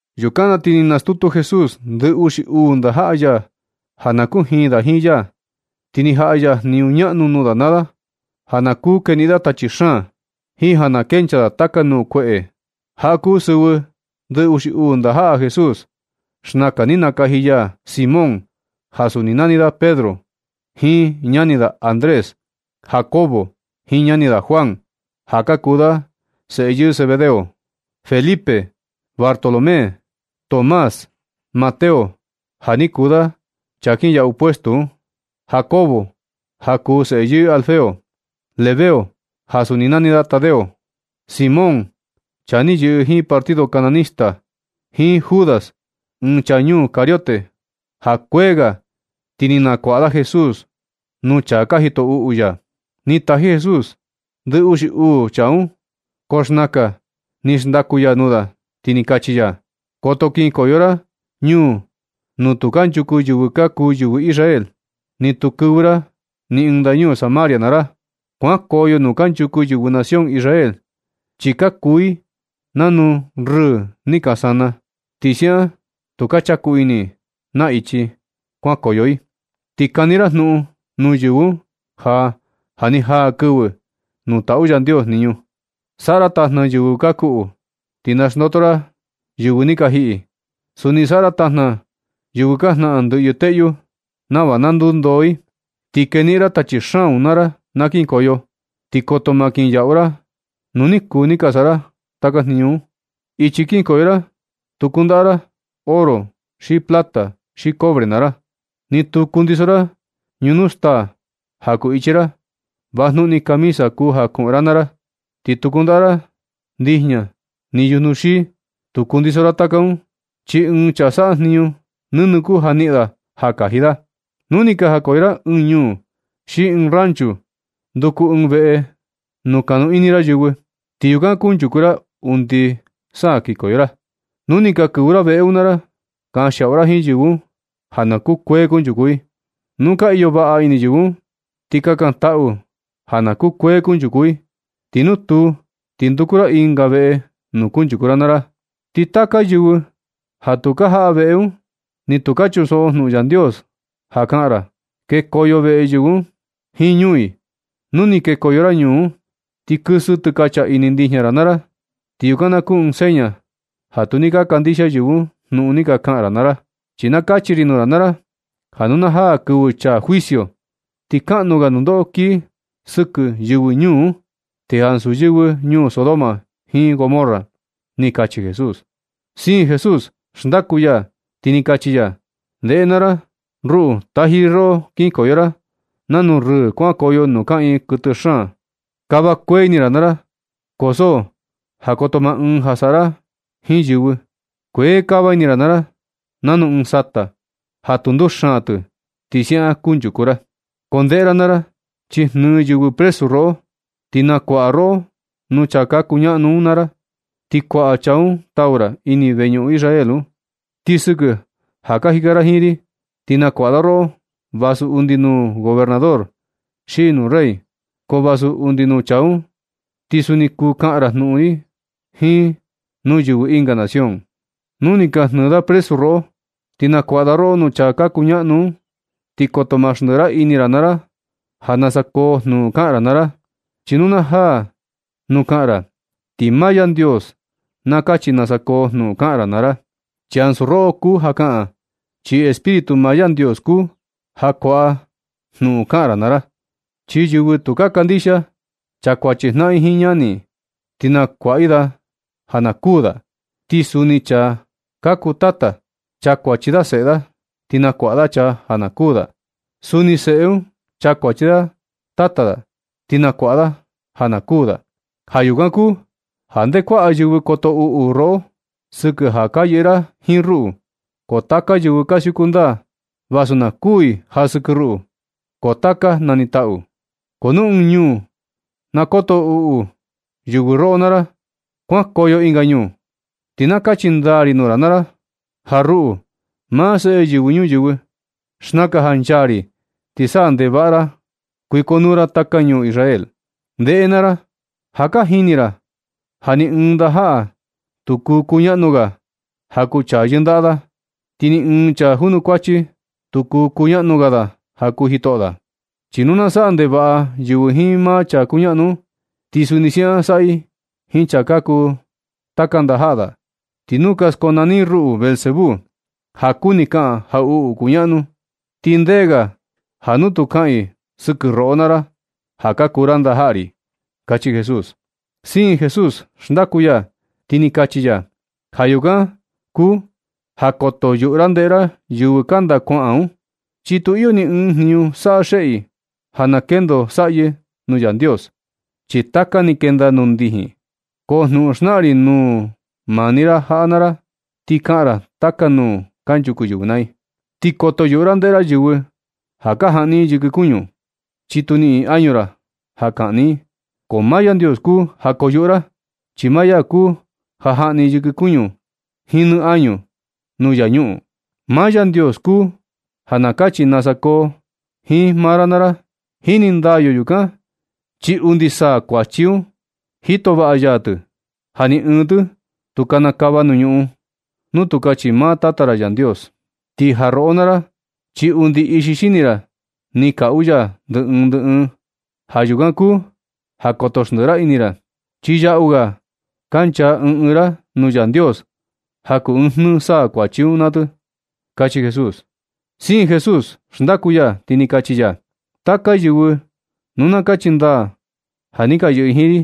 Yukan na ti ni nastutu Jesús ndɨ uxi uu ndajaꞌa ya ja na kujiin da jiin ya, ti ni jaꞌa ya jniñu ñaꞌnu nuu da naa da, ja na kuu keniꞌin da tachi xaan jiin ja na kenchaa da taka nuu kueꞌe. Jaꞌa ka kuu sɨvɨ ndɨ uxi uu ndajaꞌa Jesús. Xnakan ni nakaji ya Simón, ja suni nani da Pedro, jiin ñani da Andrés; Jacobo jiin ñani da Juan, ja ka kuu da seꞌe yɨɨ Zebedeo; Felipe; Bartolomé; Tomás; Mateo ja ni kuu da chaa kinyaꞌu puestu un; Jacobo ja kuu seꞌe yɨɨ Alfeo; Lebeo ja suni nani da Tadeo; Simón, chaa ni yɨꞌɨ jiin partido Kananista; jiin Judas, ɨɨn chaa ñuu Cariote ja kuee ga ti ni nakuaꞌa da Jesús nuu enemigo ya. Ni taji Jesús ndɨ uxi uu chaa un, ko xnakan ni xndaku ya nuu da, ti ni kachi ya: ―Koto kinkoyo ra ñuu nuu tu kanchuku yɨvɨ ka kuu yɨvɨ Israel, ni tu kɨvɨ ra ni ɨɨn ndañu Samaria naa ra. Kuankoyo nuu kanchuku yɨvɨ nación Israel, chi ka kuu i nanu rɨɨ ni ka sana, ti siaꞌan tu ka chaku ini i na ichi kuankoyo i. Ti kani ra jnuꞌun nuu yɨvɨ un ja, ja ni jaa kɨvɨ nuu taꞌu Yandios jniñu. Saꞌa ra tajna yɨvɨ ka kuꞌu, ti na xndoto ra yɨvɨ ni ka jiꞌi. Suni saꞌa ra tajna yɨvɨ ka jnaꞌan ndɨꞌyɨ teꞌyu nava na ndundoo i. Ti keniꞌin ra tachi xaan naa ra na kinkoyo. Ti koto maa kinyaꞌu ra nu ni kuu ni ka saꞌa ra taka jniñu un. Ichi kinkoyo ra tu kundaꞌa ra oro, ni plata, ni cobre naa ra. Ni tu kundiso ra ñunu staa ja kuu ichi ra. Vajnuꞌun ni camisa kuu ja kuꞌun ra naa ra, ti tu kundaꞌa ra ndijña ni yujnu xii. Tu kundiso ra taka un, chi ɨɨn chaa saꞌa jniñu nɨnɨ kuu ja niꞌin da ja kaji da. Nu ni jakoyo ra ɨɨn ñuu xi ɨɨn ranchu, nduku ɨɨn veꞌe nuu kanu ini ra yɨvɨ, ti yukan kunchuku ra undi sa kinkoyo ra. Nu ni ka kɨvɨ ra veꞌe un naa ra, kanxiaꞌu ra jiin yɨvɨ un, ja na kukuee kunchuku i. Nu ka iyo vaꞌa ini yɨvɨ un, ti kakantaꞌu ja na kukuee kunchuku i. Ti nu tuu, ti nduku ra ɨnga veꞌe nuu kunchuku ra naa ra. Ti taka yɨvɨ ja tu ka jaꞌa veꞌe un, ni tu ka chunsoꞌo jnuꞌun Yandios ka kaꞌan ra, kekoyo veꞌe yɨvɨ un jiin ñuu i. Nu ni kekoyo ra ñuu un, ti kɨsɨ tɨkacha ini ndijña ra naa ra, ti yukan na kuu ɨɨn seña ja tu ni ka kandixia yɨvɨ un jnuꞌun ni ka kaꞌan ra naa ra. Chi na kachi ri nuu ra naa ra, ja nu na jaa kɨvɨ chaa juicio, ti kaꞌnu ga nundoꞌo kii sɨkɨ yɨvɨ ñuu un, ti ansu yɨvɨ ñuu Sodoma jiin Gomorra ―ni kachi Jesús. Siin Jesús xndaku ya, ti ni kachi ya: ―Ndeꞌe naa ra, ruꞌu taji ri roꞌo kinkoyo ra nanu rɨɨ kuankoyo nuu kaꞌiin kɨtɨ xaan. Kava vivo ra naa ra, ko so ja koto maa ɨɨn ja saꞌa ra jiin yɨvɨ. Kuee kava ini ra naa ra nanu ɨɨn sata, ja tu nduxaan tɨ. Ti siaꞌan kunchuku ra. Ko ndeꞌe ra naa ra, chi jnɨɨ yɨvɨ presu roꞌo, ti nakuaꞌa roꞌo nuu chaa ka kuñaꞌnu un naa ra, ti kuaꞌa chaa un tau ra ini veñuꞌun Israel un. Ti sɨkɨ ja ka jika ra jiin ri, ti nakuaꞌa da roꞌo vasu undi nuu gobernador xi nuu rey, ko vasu undi nuu chaa un, ti suni kuu kaꞌan ra jnuꞌun ri jiin nuu yɨvɨ ɨnga nación. Nu ni ka jnɨɨ da presu roꞌo, ti nakuaꞌa da roꞌo nuu chaa ka kuñaꞌnu un, ti koto ma xndiꞌi ra ini ra naa ra, ja nasa koo jnuꞌun kaꞌan ra naa ra, chi nu na jaa nuu kaꞌan ra, ti maa Yandios na kachi nasa koo jnuꞌun kaꞌan ra naa ra. Chi ansu roꞌo kuu ja kaꞌan, chi Espíritu maa Yandios kuu ja kuaꞌa jnuꞌun kaꞌan ra naa ra. Chi yɨvɨ tu ka kandixia, chakuachi jnaꞌan i jiin ñani i, ti nakuaꞌa i da ja na kuū da. Ti suni chaa ka kuu tata, chakuachi da seꞌe da, ti nakuaꞌa da chaa ja na kuū da. Ti suni seꞌe un, chakuachi i tata i, ti nakuaꞌa i da ja na kuu da. Ja yukan kuu ja nde kuaꞌa yɨvɨ koto uꞌu roꞌo sɨkɨ ja ka yɨꞌɨ ra jiin ruꞌu, ko taka yɨvɨ ka siuku ndaa, vasu na kuui ja sɨkɨ ruꞌu, ko taka nanitaꞌu. Ko nu ɨɨn ñuu na koto uꞌu yɨvɨ roꞌo naa ra, kuankoyo ɨnga ñuu. Ti na kachi ndaa ri nuu ra naa ra ja ruꞌu, maa Seꞌe Yɨvɨ Ñuyɨvɨ, xnaka ja nchaa ri ti sa ndekava ra kuikonuu ra taka ñuu Israel. Ndeꞌe naa ra, ja ka jini ra ja ni ɨɨn ndajaꞌa tu kuu kuñaꞌnu ga ja kuu chaa yɨndaꞌa da, ti ni ɨɨn chaa junukuachi tu kuu kuñaꞌnu ga da ja kuu jitoꞌo da. Chi nu na saꞌa ndevaꞌa yɨvɨ jiin maa chaa kuñaꞌnu un, ti suni siaꞌan saꞌa i jiin chaa ka kuu taka ndajaꞌa da. Ti nu ka skonani i ruꞌu Beelzebú (ja kuni kaꞌan jaꞌuꞌu kuñaꞌnu), ti ndee ga ja nu tu kaꞌan i sɨkɨ roꞌo naa ra ja ka kuu ra ndajaꞌa ri ―kachi Jesús. Siin Jesús xndaku ya, ti ni kachi ya: ―Ja yukan kuu ja koto yuꞌu ra ndeꞌe ra yɨvɨ kanda kuaꞌan un, chi tu iyo ni ɨɨn jniñu saꞌa xeꞌe i ja na kendo saꞌyɨ nuu Yandios, chi taka ni kenda nuu ndijin. Ko jnuꞌun xnaꞌan ri nuu maa ni ra jaꞌa naa ra, ti kaꞌan ra taka nuu kanchuku yɨvɨ naa i. Ti koto yuꞌu ra ndeꞌe ra yɨvɨ ka jaꞌni yɨkɨ kuñu, chi tu niꞌin i añu ra ja kaꞌni i. Ko maa Yandios kuu ja koyuꞌu ra, chi maa ya kuu ja jaꞌni yɨkɨ kuñu nɨ jiin añu nuu infiernu. Maa Yandios kuu ja na kachi nasa koo jiin maa ra naa ra. Jini ndaa yo yukan, chi undi saa kuachi un, jito vaꞌa ya tɨ, ja ni ɨɨn tɨ tu kanakava nuu ñuꞌun nu tu kachi maa Tata ra Yandios. Ti ja roꞌo naa ra, chi undi ixi xini ra ni kaꞌu ya ndɨ ɨɨn ndɨ ɨɨn. Ja yukan kuu ja koto xndɨꞌɨ ini ra, chi yaꞌu ga ka nchaa ɨɨn ɨɨn ra nuu Yandios ja kuu ɨɨn jnɨɨ saa kuachi un naa tɨ ―kachi Jesús. Siin Jesús xndaku ya, ti ni kachi ya: ―Taka yɨvɨ nu na kachi ndaa ja ni ka yɨꞌɨ i jiin ri,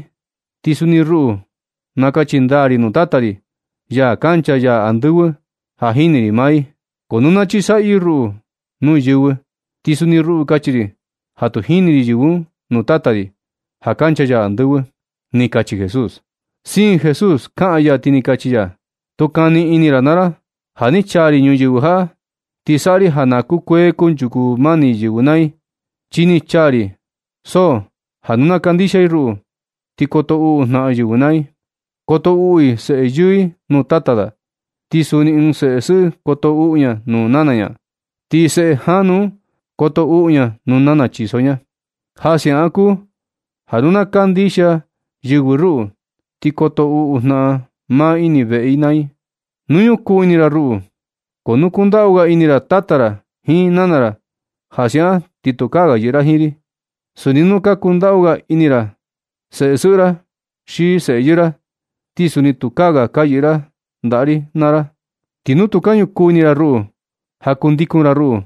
ti suni ruꞌu nakachi ndaa ri nuu Tata ri, ya kancha ya andɨvɨ, ja jini ri maa i. Ko nu na chisaꞌyɨ i ruꞌu nuu yɨvɨ, ti suni ruꞌu kachi ri ja tu jini ri yɨvɨ un nuu Tata ri, ja kancha ya andɨvɨ ―ni kachi Jesús. Siin Jesús kaꞌan ya, ti ni kachi ya: ―Tu kani ini ra naa ra ja ni chaa ri ñuyɨvɨ jaꞌa, ti saꞌa ri ja na kukuee kunchuku mani yɨvɨ naa i. Chi ni chaa ri, ko so ja nu na kandixia i ruꞌu, ti koto uꞌu jnaꞌan yɨvɨ naa i. Koto uꞌu ɨɨn seꞌe yɨɨ nuu tata da, ti suni ɨɨn seꞌe sɨꞌɨ koto uꞌu ña nuu nana ña, ti seꞌe janu un koto uꞌu ña nuu nana chiso ña. Ja siaꞌan kuu ja nu na kandixia yɨvɨ ruꞌu, ti koto uꞌu jnaꞌan maa i ini veꞌe i naa i. Nu ñukuu ini ra ruꞌu, ko nu kundaꞌu ga ini ra tata ra jiin nana ra, ja siaꞌan ti tukaa ga yɨꞌɨ ra jiin ri. Suni nu ka kundaꞌu ga ini ra seꞌe sɨꞌɨ ra xi seꞌe yɨɨ ra, ti suni tukaa ga ka yɨꞌɨ ra ndaꞌa ri naa ra. Ti nu tu ka ñukuu ini ra ruꞌu ja kundikun ra ruꞌu,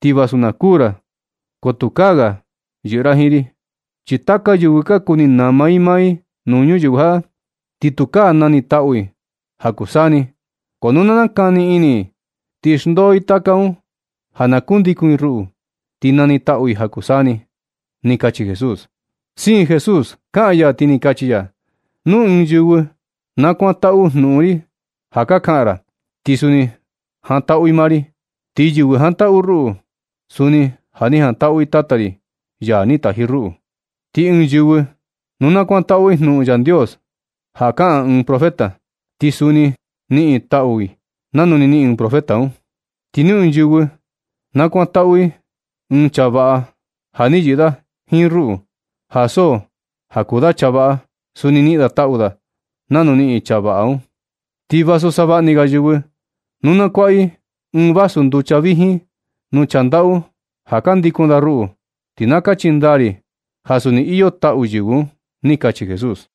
ti vasu na kuū ra, ko tukaa ga ka yɨꞌɨ ra jiin ri. Chi taka yɨvɨ ka kuni nama i maa i nuu ñuyɨvɨ jaꞌa, ti tukaa nanitaꞌu i ja kuu saa ni. Ko nu na nakani ini i ti xndoo i taka un ja na kundikun i ruꞌu, ti nanitaꞌu i ja kuu saa ni ―ni kachi Jesús. Siin Jesús kaꞌan ya, ti ni kachi ya: ―Nu ɨɨn yɨvɨ na kuantaꞌu jnuꞌun ri ja ka kaꞌan ra, ti suni jantaꞌu i maa ri. Ti yɨvɨ jantaꞌu ruꞌu, suni ja ni jantaꞌu i Tata ri, ya ni taji ruꞌu. Ti ɨɨn yɨvɨ nu na kuantaꞌu i jnuꞌun Yandios ja kaꞌan ɨɨn profeta, ti suni niꞌin i taꞌu i nanu ni niꞌin profeta un. Ti nu ɨɨn yɨvɨ na kuantaꞌu i ɨɨn chaa vaꞌa ja ni yɨꞌɨ da jiin ruꞌu, ja so ja kuu da chaa vaꞌa, suni niꞌin da taꞌu da nanu niꞌin chaa vaꞌa un. Ti vasu savaꞌa ni ga yɨvɨ nu na kuaꞌa i ɨɨn vasu nducha vijin nuu chaa ndaꞌu ja ka ndikun da ruꞌu, ti na kachi ndaa ri ja suni iyo taꞌu yɨvɨ un ―ni kachi Jesús.